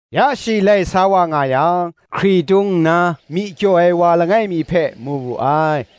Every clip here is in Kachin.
Ya shi lai sa wa nga yang, hkritung kaw nna myi kyaw ai wa langai mi hpe mu wu ai.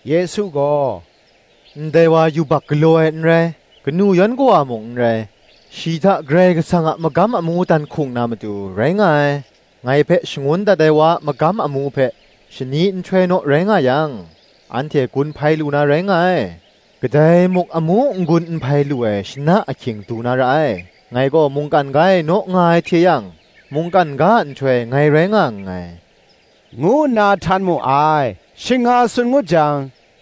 Yesu gaw, “Ndai wa yubak galaw ai n rai, kanu yan kawa mung n rai; shi hta Karai Kasang a magam amu dan hkung na matu, rai nga ai. Ngai hpe shangun dat ai wa a magam amu hpe, shani nhtoi naw rai nga yang, anhte gun hpai lu na rai nga ai: kadai muk amu n gun n hpai lu ai shana ahkying du na ra ai. Ngai gaw mungkan ga e naw nga ai hte yang, mungkan ga a nhtoi ngai rai nga nngai,” ngu nna htan mu ai. Shing nga tsun ngut jang,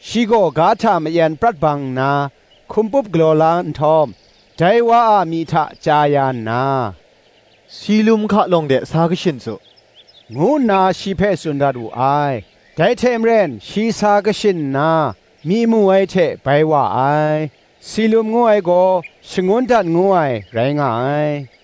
shi gaw ga hta mayen prat bang nna, hkumpup galaw la nhtawm, dai wa a myi hta chya ya nna, “Silum hka lawng de sa kashin su,” ngu nna shi hpe tsun dat wu ai: dai hte maren shi sa kashin nna, myi mu ai hte bai wa ai: (Silum ngu ai gaw, shangun dat ngu ai, rai nga ai.)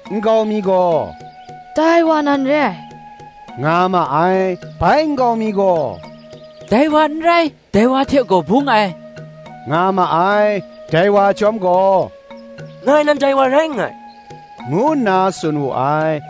Nkau mi gaw, “Dai wa nan re ai,” nga ma ai. Bai nkau mi gaw, Dai wa n rai, dai wa hte gaw bung ai, nga ma ai. Dai wa chyawm gaw, Ngai nan dai wa rai nngai,” ngu nna tsun wu ai.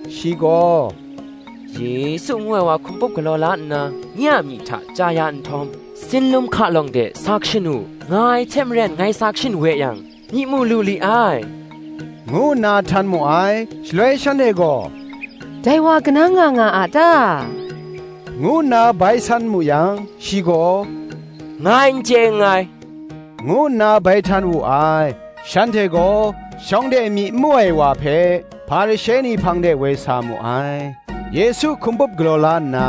Shi gaw, “Yesu ngu ai wa hkumpup galaw la nna, nye a myi hta chya ya nhtawm, Silum hka lawng de sa kashin u, nga ai hte maren ngai sa kashin we yang, myi mu lu li ai,” ngu nna htan mu ai. Shaloi shanhte gaw, “Dai wa kanang nga nga a ta? ngu nna bai san mu yang, Shi gaw, “Ngai n chye nngai,” ngu nna bai htan wu ai. Shanhte gaw, shawng de myi n mu ai wa hpe Hparishe ni hpang de woi sa mu ai: Yesu hkumpup galaw la nna,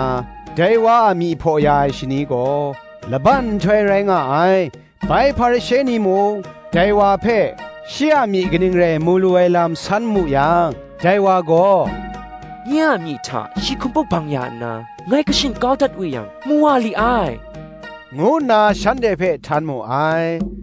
dai wa a myi hpaw ya ai shani gaw, laban nhtoi rai nga ai. Bai Hparishe ni mung, dai wa hpe, shi a myi kaning rai mu lu ai lam san mu yang, dai wa gaw, “Nye a myi hta shi hkumpup bang ya nna, ngai kashin kau dat we yang mu wa li ai,” ngu nna shanhte hpe htan mu ai.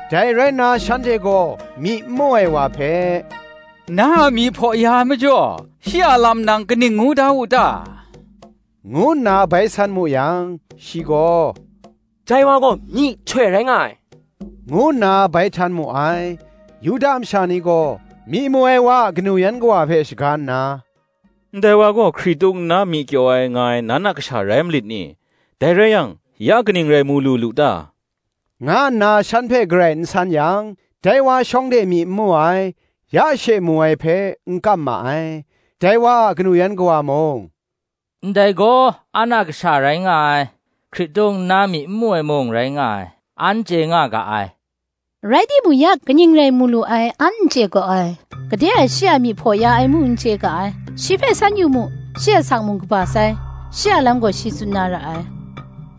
Dai rai nna shanhte gaw myi n mu ai wa hpe, “Na a myi hpaw ya ai majaw, shi a lam nang kaning ngu da wu ta?” ngu nna bai san mu yang, shi gaw, “Dai wa gaw myihtoi rai nga ai,” ngu nna bai htan mu ai. Yuda masha ni gaw myi mu ai wa a kanu yan kawa hpe shaga nna, “Ndai wa gaw hkritung kaw nna myi kyaw ai, nga ai, nan a kasha rai malit ni? dai rai yang, ya kaning rai mu lu lu ta? nga nna shan hpe garai n san yang, dai wa shawng de myi n mu ai, ya she mu ai hpe, n kam ma ai.” Dai wa a kanu yan kawa mung, “Ndai gaw an a kasha rai nga ai, hkritung kaw nna myi n mu ai mung rai nga ai, an chye nga ga ai: rai timung, ya kaning rai mu lu ai, an n chye gaw ai, gade e shi a myi hpaw ya ai mung, n chye ga ai: shi hpe san yu mu: shi asak mung kaba sai, shi a lam gaw shi tsun na ra ai,”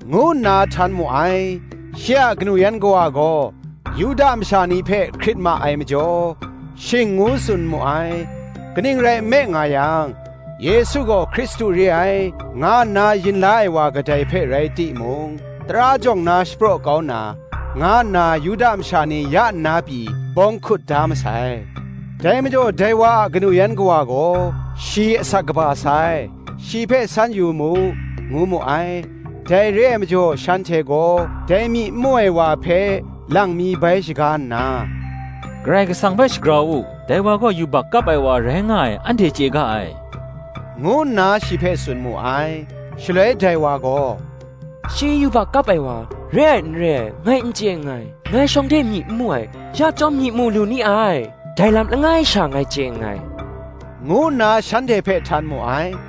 ngu nna htan mu ai. Shi a kanu yan kawa gaw Yuda masha ni hpe hkrit ma ai majaw, shing ngu tsun mu ai: kaning rai nme nga yang, Yesu gaw Hkristu re ai, nga nna yin la ai wa kadai hpe rai timung, tara jawng na shapraw kau na, nga nna Yuda masha ni ya nna pyi bawng hkut da masai. Dai majaw dai wa a kanu yan kawa gaw, ‘Shi asak kaba sai, shi hpe san yu mu,” ngu mu ai. Dai re ai majaw shanhte gaw dai myi n mu ai wa hpe lang mi bai shaga nna, “Karai Kasang hpe shagrau u; dai wa gaw yubak kap ai wa rai nga ai anhte chye ga ai,” ngu nna shi hpe tsun mu ai. Shaloi dai wa gaw, “Shi yubak kap ai wa re ai n re ai, ngai n chye nngai: ngai shawng de myi n mu ai, ya chyawm gaw mu lu ni ai, dai lam langai sha ngai chye nngai,” ngu nna shanhte hpe htan mu ai.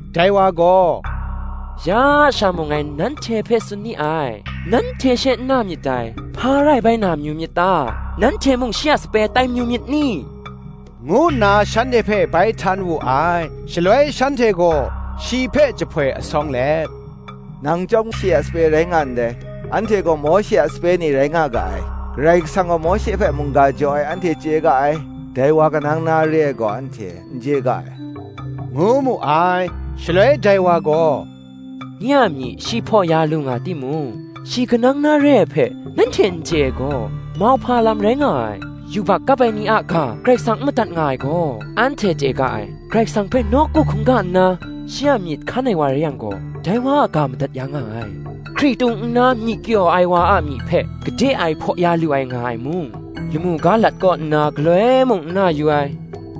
Dai wa gaw, “Ya sha mung ngai nanhte hpe tsun ni ai, nanhte she n na myit dai; hpa rai bai na mayu myit ta? nanhte mung shi a sape tai mayu myit ni?” ngu nna shanhte hpe bai htan wu ai. Shaloi shanhte gaw shi hpe jahpoi asawng let, “Nang chyawm shi a sape rai nga ndai, anhte gaw Mawshe a sape ni rai nga ga ai: Karai Kasang gaw Mawshe hpe mungga jaw ai anhte chye ga ai; dai wa kanang na re ai gaw, anhte n chye ga ai,” ngu mu ai. Shaloi dai wa gaw, “Nye a myi shi hpaw ya lu nga timung, shi kanang na re ai hpe nanhte n chye ai gaw, mauhpa lam rai nga ai. Yubak kap ai ni a ga Karai Kasang n madat nga ai gaw, anhte chye ga ai: Karai Kasang hpe nawku hkungga nna, shi a myit hkan ai wa rai yang gaw, dai wa a ga madat ya nga ai. Hkritung kaw nna myi kyaw ai wa a myi hpe, gade e hpaw ya lu ai nga ai mung, lamu ga lat kaw nna galoi mung n na yu ai.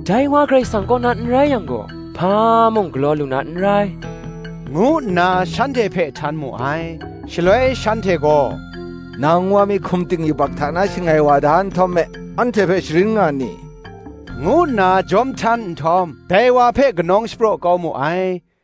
Dai wa Karai Kasang kaw na n rai yang gaw, hpa mung galaw lu na n rai,” ngu nna shanhte hpe htan mu ai. Shaloi shanhte gaw, “Nang wa mi hkum ting yubak hta na shangai wa da nhtawm me, anhte hpe sharin nga nni?” ngu nna jawm htan nhtawm, dai wa hpe kanawng shapraw kau mu ai.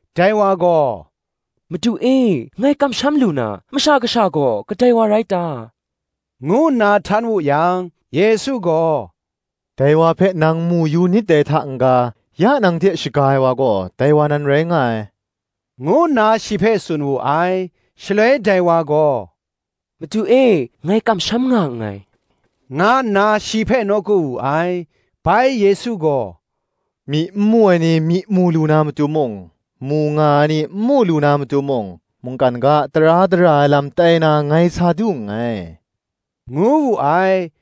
Dai wa gaw, “Madu e ngai kamsham lu na, Masha Kasha gaw kadai wa rai ta?” ngu nna htan wu yang, Yesu gaw, “Dai wa hpe nang mu yu nit dai hta n ga, ya nang hte shaga ai wa gaw, dai wa nan rai nga ai,” ngu nna shi hpe tsun wu ai. Shaloi dai wa gaw, “Madu e, ngai kamsham nga nngai,” nga nna shi hpe nawku wu ai. Bai Yesu gaw, “Myi n mu ai ni myi mu lu na matu mung, mu nga ai ni n mu lu na matu mung, mungkan ga a tara dara ai lam tai na ngai sa du nngai,” ngu wu ai.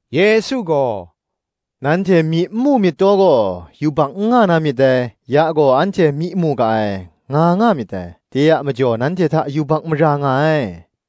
Yesu gaw, “Nanhte myi n mu myit taw gaw, yubak n nga na myit dai: ya gaw, Anhte myi mu ga ai, nga nga myit dai: de a majaw nanhte hta yubak mara nga ai.